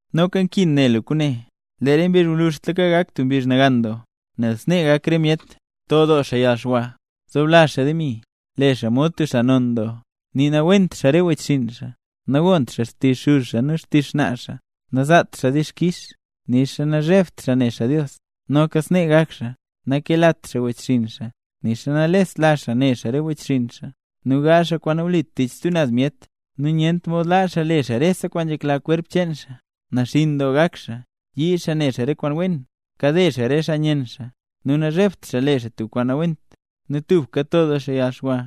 Noka nkin ne lu kwaane: Re mbizh gwluzhtlaka gak tub mbizh nagan doo, nel snee gak re myet: to doo xaa yalxwa, zoblazh xaa demi, le xaa mod tub xaa non doo, nii nawent xaa re wechxinn xaa, nagont xaa xtizh xuz xaa nu xtizh xnaa xaa, nazaat xaa dixkix, nixa nazhebt xaa ne xaa Dios. Noka snee gak xaa: nakelat xaa wechxinn xaa, nixa nalest la xaa ne xaa re wechxinn xaa, nu gaazh xaa kwaan nawlit tich stub naz myet, nu nyent mod laa xaa le xaa rese kwaan nzhekla xkwerp xaa, naxinn doo gak xaa, yii xaa ne xaa re kwaan wen, kade xaa re xaa nyenn xaa, nu nazhebt xaa le xaa tub kwaan nawent, nu tubka to doo xaa yalxwa,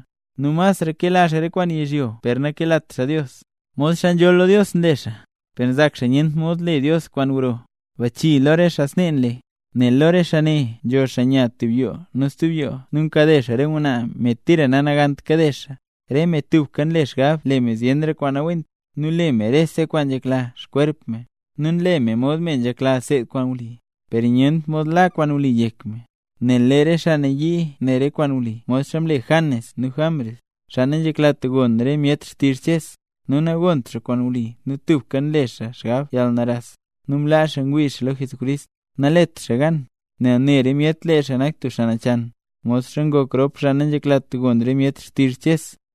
nu masra kela xaa re kwaan yizhyo per nakelat xaa Dios, Mod xaa nzholl lo Dios nle xaa, per nzak xaa nyent mod le Dios kwaan gro. Bachii lo re xaa snee nle. Nel lo re xaa ne nzho xaa nya tub yoo nu stub yoo nu nkade xaa re ngwnaa, me tira nanagant kade xaa. Re me ne tubka nle xgab le me zyenra kwaan nawent, nu le me rese kwaan nzhekla xkwerp me. Nu nle me mod me nzhekla seed me kwaan wli, per nyent mod la kwaan wli yek me. Nel lee re xaa ne nayii ne kwaan wli modxa mle Janes nu Jambres, xaa nanzheklat gon re myet xtizh Ches. Nu nagont xaa kwaan wli nu tubka nle xaa xgab yalnaras, nu mlaa xaa ngwii xaa lo Jesucrist. Nalet xaa gan, nel ne re myet lee xaa nak tub xaa nachan, modxa ngok rop xaa nanzheklat gon re myet xtizh Ches.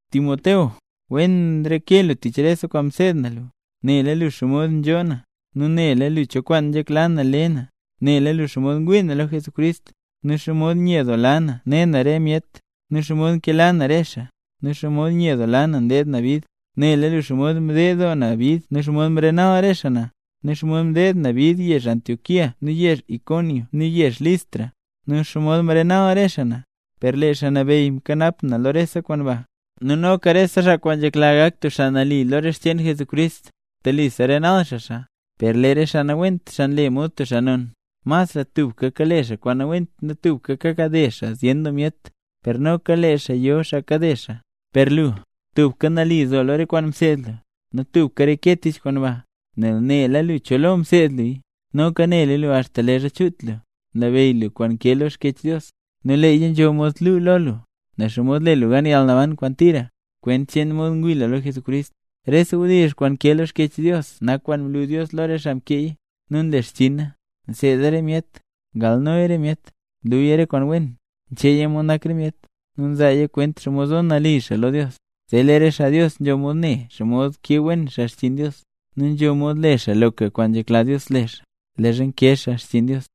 Timoteo, wen nreke lu tich rese kwaan mseed na lu, nu nela lu xomod nzhoo na, nu nela lu cho kwaan nzhekla na le na. Nela lu xomod ngwii na lo Jesucrist, nu xomod nyedoola na ne na re myet, nu xomod nkela na re xaa, nu xomod nyedoola na ndeed na bid. Nela lu xomod mded doo na bid nu xomod mrenal re xaa na, nu xomod mdeed na bid yezh Antioquía nu yezh Iconio nu yezh Listra, nu xomod mrenal re xaa na. Per lee Xaa Nabeyy mkanap na lo re kwaan ba. Nu noka rese xaa kwaan nzhekla gak tub xaa nali lo re xcheen Jesucrist, telisa renal xaa xaa. Per lee re xaa nawent, xaa nle mod xaa non, masra tubka kale xaa kwaan nawent nu tubka kakade xaa zyen doo myet, per noka lee xaa yo xaa kade xaa. Per lu, tubka nali zo lo re kwaan mseed lu, nu tubka reke tich kwaan ba, nel nela lu cho lo mseed luya. Noka nela lu axta leezha chut lu, nlabeyy lu kwaan nkee lo Xkyech Dios. Nu leeya nzho mod lu lo lu, nen xomod le lu gan yalnaban kwaan tira, kwent cheen mod ngwii lu lo Jesucrist. Rese wdizh kwaan nkee lo Xkyech Dios nak kwaan mlu Dios lo re xaa mkeeya, nu nle xchiina: nseeda re myet, ngalnoya re myet, nluya re kwaan wen, ncheeya mod nak re myet, nu nzaaya kwent xomod zo nali xaa lo Dios. Zee lee re xaa Dios nzho mod ne xomod kee wen xaa xchiin Dios, nu nzho mod le xaa loka kwaan nzhekla Dios le xaa, leezha nkee xaa xchiin Dios.